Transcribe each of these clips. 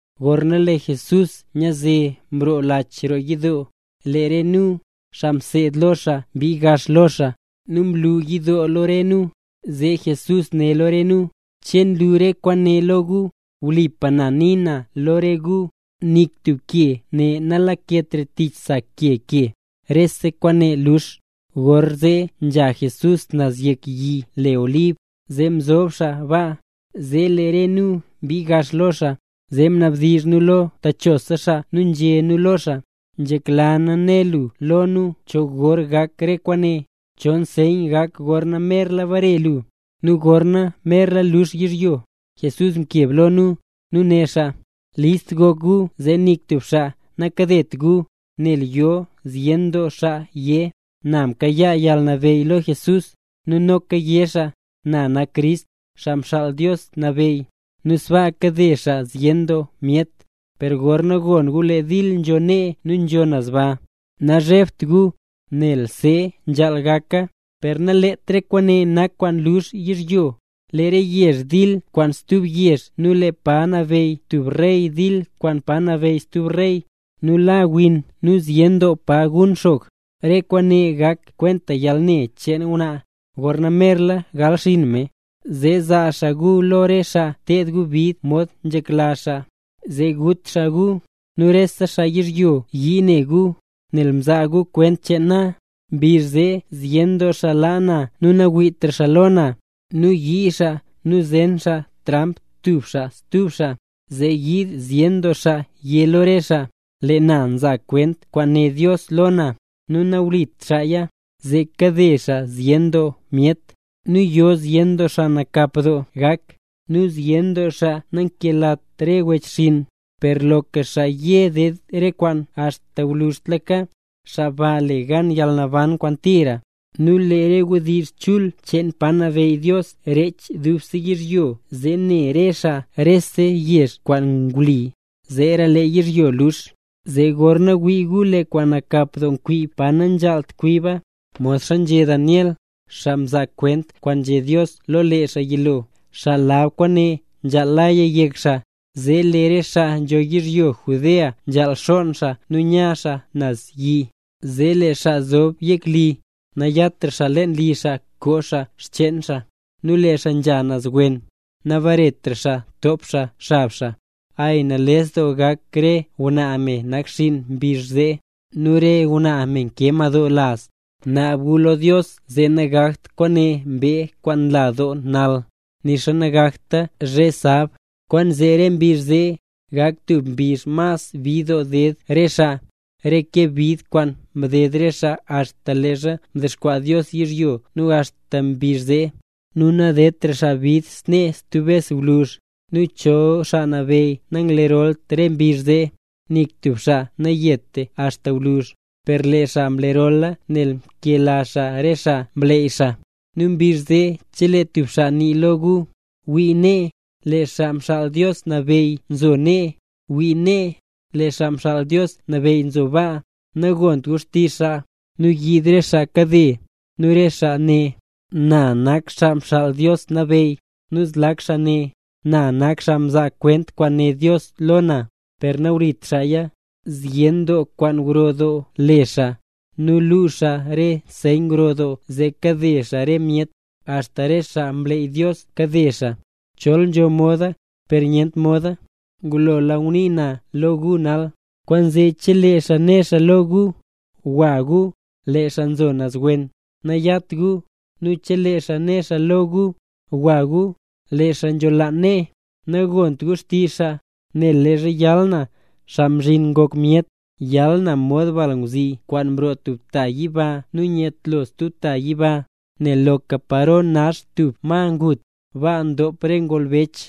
Gorna lee Jesús nyaze mroo lach roo yidoo, lee re nu, xaa mseed lo xaa mbii gax lo xaa, nu mlu yidoo lo re nu. Zee Jesús né lo re nu: —¿Che nlu re kwaane lo gu? ¡Wlipa na nii na lo re gu, nik tub ke ne nalaketra tich sa ke ke, rese kwaane lux! Gorzee nzha Jesús naz yek yi le Olib, zee mzob xaa baa, zee lee re nu mbii gax lo xaa, zee mnabdizh nu lo techosa xaa nu nzhé nu lo xaa: —Nzhekla nu né lu lo nu cho gor gak re kwaane. ¿Cho nseyn gak gorna merla bare lu, nu gorna merla lux yizhyo? Jesús mkeb lo nu, nu né xaa: —List gok gu zee nik tub xaa nakadet gu. Nel yo zyen doo xaa yé: “Na mkayaa yalnabeyy lo Jesús”. Nu noka yé xaa: “Na nak Crist, Xaa Mxaal Dios Nabeyy”, nu sbaa kade xaa zyen doo myet. Per gorna gon gu lee dil nzho nee nu nzho naz baa, nazhebt gu, nel see nzhaal gaka. Per nalet re kwaane nak kwaan lux yizhyo. Lee re yezh dil kwaan stub yezh nu lee pa nabeyy tub rey dil kwaan pa nabeyy stub rey, nu la win nu zyen doo pa nye doo gun xog. Re kwaane gak kwenta yalne cheen ngwnaa, gorna merla gal xinn me. ’Zee zaa xaa gu lo re xaa ted gu bid mod nzhekla xaa, zee gut xaa gu. Nu rese xaa yizhyo yii ne gu, nel nzaa gu kwent cheen na. Mbizh zee zyen doo xaa laa na nu nawiitra xaa lo na, zee yii xaa nu zen xaa tramp tub xaa nu stub xaa. Zee yiid zyen doo xaa yé lo re xaa: “Lee na nzaa kwent kwaan né Dios lo na”, nu nawlit xaaya, zee kade xaa zyen doo myet. Nu yo zyen doo xaa nakap doo gak, nu zyen doo xaa nakelatra re wechxinn. Per loka xaa ye ded re kwaane axta gwluzhtlaka, xaa ba le gan yalnaban kwaan tira. Nu lee re wdizh chul cheen pa nabeyy Dios rech dubse yizhyo, zee ne re xaa rese yezh kwaan wli. Zeera lee yizhyo lux. ’Zee gorna wii gu lee kwaan nakap doo kwib pa nanzhaalt kwiba, modxa nzhé Daniel, xaa mzaa kwent kwaan nzhé Dios lo lee xaa yilo (xaa lab kwaane nzhaal laya yek xaa), zee lee re xaa nzho yizhyo Judea nzhaal xonn xaa nu nya xaa naz yi. Zee lee xaa nzob yek li, nayatra leen li xaa koo xaa xcheen xaa. Nu lee xaa nzha naz wen, nabaretra xaa top xaa xab xaa. Ay, nales doo gak re ngwnaa me nakxiin mbizh zee, nu re ngwnaa me nkee madoo laz. Naab gu lo Dios zee nagakt kwaane mbee kwaan nla doo nal, nixa nagakta zhe sab. Kwaanzee re mbizh zee, gak tub mbizh mas bid doo ded re xaa, ke re bid kwaan mded re xaa axta leezha mdexkwaa Dios yizhyo nu axta mbizh zee, nu nadedtra xaa bid snee stub bes gwluzh. Nu chol Xaa Nabeyy nanglerolt re mbizh zee, nik tub xaa nanget axta gwluzh. Per lee xaa mlerola nel nkela xaa re xaa mleey xaa. ’Nu mbizh zee chelee tub xaa nii lo gu: “Wii nee, lee Xaa Mxaal Dios Nabeyy nzo nee. Wii nee, lee Xaa Mxaal Dios Nabeyy nzo baa”, nagont gu xtizh xaa. Nu yiid re xaa kade; nu re xaa né: “Na nak Xaa Mxaal Dios Nabeyy”, nu zlak xaa né: “Na nak xaa nzaa kwent kwaan né Dios lo na”, per nawlit xaaya. Zyen doo kwaan gro doo le xaa, nu luu xaa re nseyn gro doo zee kade xaa re myet, axta re xaa mleey Dios kade xaa, chol nzho moda, per nyent moda. Ngulola ngunii naya lo gu nal. Kwaanzee chelee xaa né xaa lo gu: “Gwa gu, lee xaa nzo naz wen”, nayat gu; nu chelee xaa né xaa lo gu: “Gwa gu, lee xaa nzholaan nee”, nagont gu xtizh xaa. Nel leezha yal na, Xaa Mzhin Ngok Myet, yal na mod balngwzi kwaan nroo tub ta yiba nu nyetlo stub ta yiba. Nel loka paro nax tub ma ngut, baa ndop re ngolbech.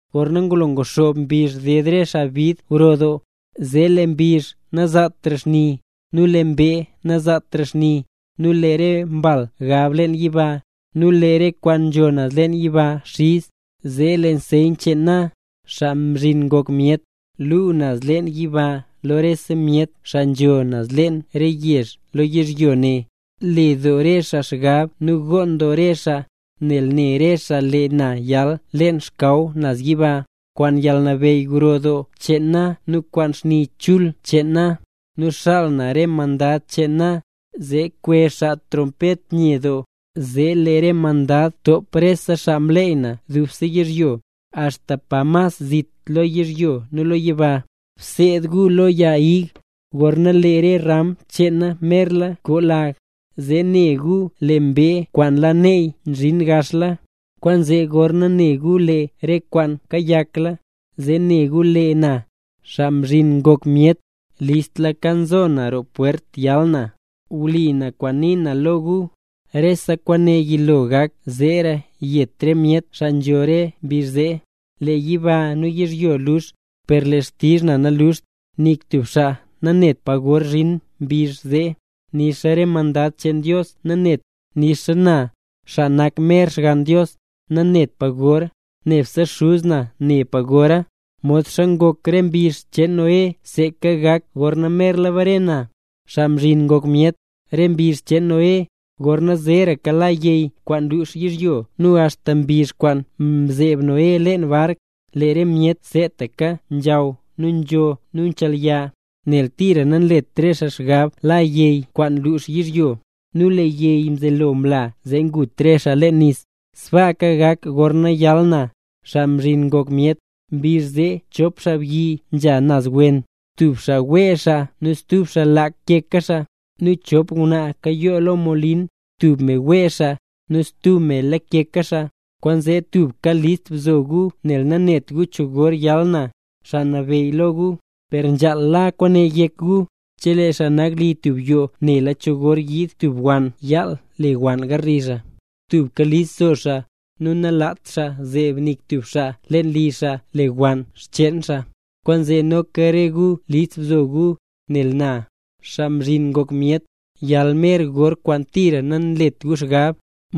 ’Gorna ngulo nguxoob mbizh ded re xaa bid gro doo, zee lee mbizh nazaatra xni, nu lee mbee nazaatra xni, nu lee re mbal gab leen yiba, nu lee re kwaan nzho naz leen yiba xiz. Zee lee nseyn cheen na, Xaa Mzhin Ngok Myet, luu naz leen yiba lo rese myet xaa nzho leen re yezh lo yizhyo ne. Le doo re xaa xgab nu gonn doo re xaa, nel ne re xaa lee na nyal leen xkaw naz yiba, kwaan yalnabeyy gro doo cheen na nu kwaan xni chul cheen na. Nu xaal na re mandad cheen na, zee kwezh xaa trompet nye doo, zee lee re mandad top re xaa mleey na dubse yizhyo, axta pa mas zit lo yizhyo nu lo yiba. ’Bseed gu lo yag ig, gorna lee re ram cheena merla koo lag, zee ne gu lee mbee kwaan la neey zhin gaxla. Kwaanzee gorna ne gu lee re kwaane kayakla, zee ne gu lee na, Xaa Mzhin Ngok Myet, listla nzo na roo pwert yal na. Wlipa na kwaan nii na lo gu, rese kwaane yilo gak zeera yet re myet xaa nzho re mbizh zee. Lee yiba nu yizhyo lux, per lee xtizh na naluxt. ’Nik tub xaa nanet pa gor zhin mbizh zee, nixa re mandad cheen Dios naneta, nixa na, xaa nak mer Xgann Dios, nanet na pa gor, nebse Xuz na ne pa gora. ’Modxa ngok re mbizh cheen Noé seeka gak gorna merla bare na, Xaa Mzhin Ngok Myet. Re mbizh cheen Noé, gorna zeeraka la yey kwaan lux yizhyo nu axta mbizh kwaan mzeeb Noé leen bark, lee re myet seetaka nzhaw nu nzho nu nchelya. Nel tira nanlet re xaa xgab la yey kwaan lux yizhyo, nu lee yey mzelo mla zee ngut re xaa leen nis. Sbaaka gak gorna yal na, Xaa Mzhin Ngok Myet. Mbizh zee chop xaabyi nzha naz wen, tub xaa wee xaa nu stub xaa lakeka xaa. Nu chop ngwnaa nkayoo lo molin, tub me wee xaa nu stub me lakeka xaa. ’Kwaanzee tubka list bzo gu nel nanet gu cho gor yal na, Xaa Nabeyy lo gu. Per nzhaal la kwaane yek gu: Chelee xaa nak li tub yoo nela cho gor yiid tub wann yaal lewann garli xaa, tubka list zo xaa, nu nalaat xaa zeeb nik tub xaa leen li xaa lewann xcheen xaa. Kwaanzee noka re gu list bzo gu, nel na, Xaa Mzhin Ngok Myet, yal mer gor kwaan tira nanlet gu xgab.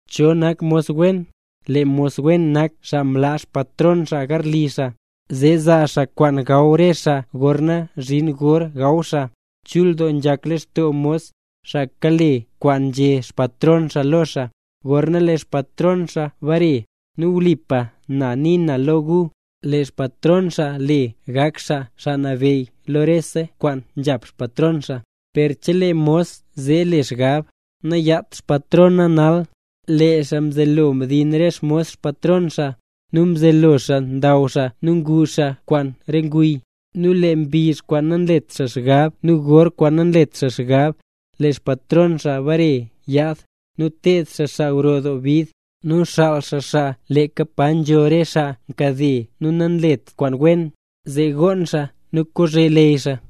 ’¿Cho nak mos wen? Lee mos wen nak xaa mlaa xpatron xaa garli xaa, zee zaa xaa kwaan gaw re xaa gorna zhin gor gaw xaa. Chul doo nzhak lextoo mos, xaa kale kwaan nzhé xpatron xaa lo xaa, gorna lee xpatron xaa bare. Nu wlipa na nii na lo gu, lee xpatron xaa le gak xaa xaa nabeyy lo rese kwaan nzhap xpatron xaa. Per chelee mos zee le xgab: “Nayat xpatron na nal”. Lee xaa mzelo mdin re xmos xpatron xaa, nu mzelo xaa ndaw xaa nu ngu xaa kwaan re nguy. Nu lee mbizh kwaan nanlet xaa xgab nu gor kwaan nanlet xaa xgab, lee xpatron xaa bare yaad. Nu ted xaa xaa gro doo bid, nu xaal xaa xaa leeka pa nzho re xaa nkade nu nanlet kwaan wen, zee gonn xaa nu kozhe leyy xaa.